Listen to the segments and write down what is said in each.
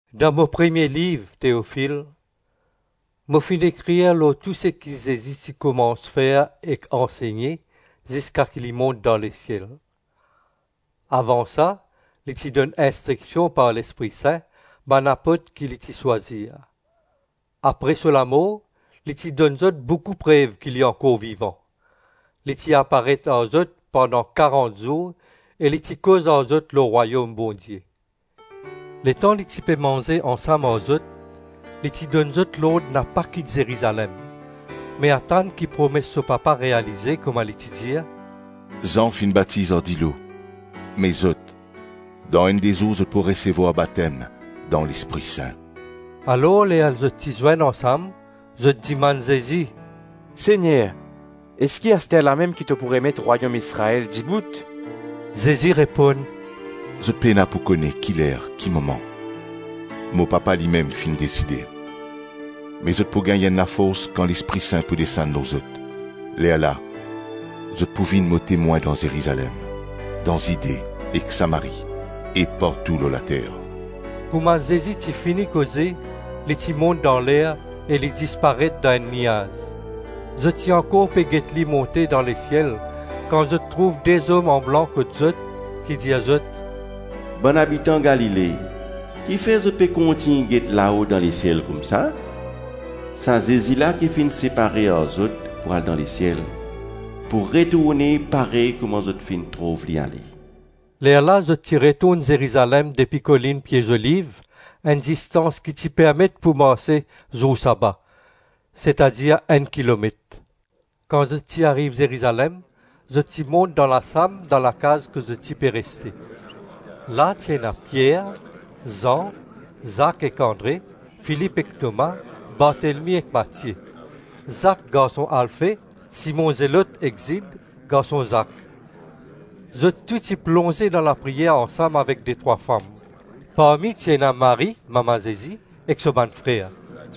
Dan mo premie liv, Teofil, mo finn ekrir lor tou seki Zezi ti koumans fer ek ansegne ziska ki li mont dan lesiel. Avan sa, li ti donn instriksion, par Lespri Sin, bann apot ki li ti swazir. Apre so lamor, li ti donn zot boukou prev ki li ankor vivan. Li ti aparet ar zot pandan karant zour e li ti koz ar zot lor Rwayom Bondie. Letan li ti pe manze ansam ar zot, li ti donn zot lord napa kit Zerizalem, me atann ki promes so Papa realize kouma li ti dir, “Zan finn batiz ar dilo, me zot, dan enn de zour zot pou resevwar batem dan Lespri Sin.” Alor ler zot ti zwenn ansam, zot dimann Zezi, “Segner, eski asterlamem ki to pou remet Rwayom Izrael dibout?” Zezi reponn, “Zot pena pou kone ki ler ki moman, mo Papa limem finn deside. Me zot pou gagn enn lafors kan Lespri Sin pou desann lor zot - lerla zot pou vinn mo temwin dan Zerizalem, dan Zide ek Samari e partou lor later.” Kouma Zezi ti fini koze, li ti mont dan ler e li disparet dan enn niaz. Zot ti ankor pe get li monte dan lesiel kan zot trouv de zom anblan kot zot ki dir zot, “Bann abitan Galile, kifer zot pe kontign get lao dan lesiel koumsa? Sa Zezi la ki finn separe ar zot pou al dan lesiel, pou retourne parey kouma zot finn trouv li ale.” Lerla zot ti retourn Zerizalem depi Kolinn Pie Zoliv, enn distans ki ti permet pou marse zour saba, setadir enn kilomet. Kan zot ti ariv Zerizalem, zot ti mont dan lasam dan lakaz kot zot ti pe reste; la ti ena Pier, Zan, Zak ek Andre, Filip ek Toma, Bartelmy ek Matie; Zak garson Alfe, Simon Zelot e Zid, garson Zak. Zot tou ti plonze dan lapriyer ansam avek detrwa fam. Parmi ti ena Marie, mama Zezi ek so bann frer.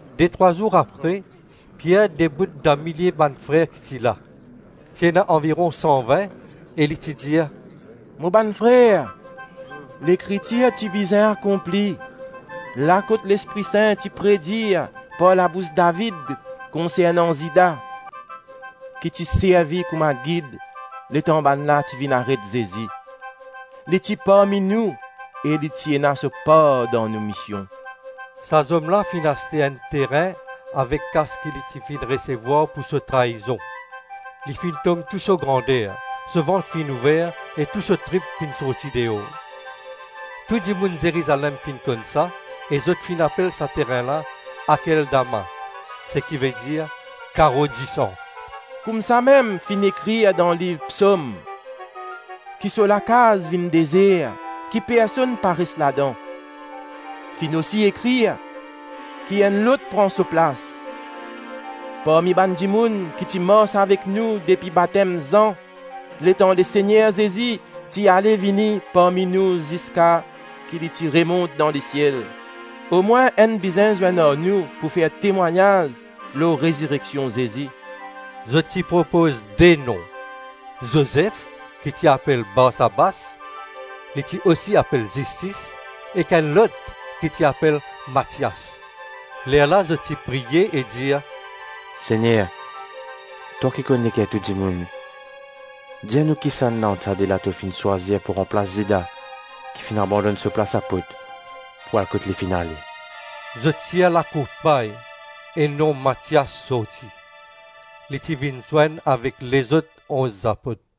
Detrwa zour apre, Pier debout dan milie bann frer ki ti la; ti ena anviron san-vin e li ti dir, “Mo bann frer, Lekritir ti bizin akonpli, la kot Lespri Sin ti predir par labous David konsernan Zida ki ti servi kouma gid letan bannla ti vinn aret Zezi. Li ti parmi nou e li ti ena so par dan nou mision.” (Sa zom la finn aste enn terin avek kas ki li ti finn resevwar pou so traizon - li finn tom tou so grander, so vant finn ouver e tou so trip finn sorti deor. Tou dimoun Zerizalem finn konn sa e zot finn apel sa terin la ‘Akeldama’, seki vedir, ‘Karo disan.’) “Koumsamem finn ekrir dan liv Psom: ‘Ki so Lakaz vinn dezer, ki personn pa res ladan.’ Finn osi ekrir: ‘Ki enn lot pran so plas.’ Parmi bann dimoun ki ti mars avek nou depi batem Zan letan Lesegner Zezi ti ale-vini parmi nou ziska ki li ti remont dan lesiel, omwin enn bizin zwenn ar nou pou fer temwagnaz lor rezireksion Zezi.” Zot ti propoz de nom: Zozef ki ti apel Barsabas (li osi apel Zistis) ek enn lot ki ti apel Matias. Lerla zot ti priye e dir, “Segner, twa ki konn leker tou dimoun, dir nou kisannla ant sa de la to finn swazir pou ranplas Zida ki finn abandonn so plas apot pou al kot li finn ale.” Zot tir lakourt-pay e nom Matias sorti. Li ti vinn zwenn avek lezot onz apot.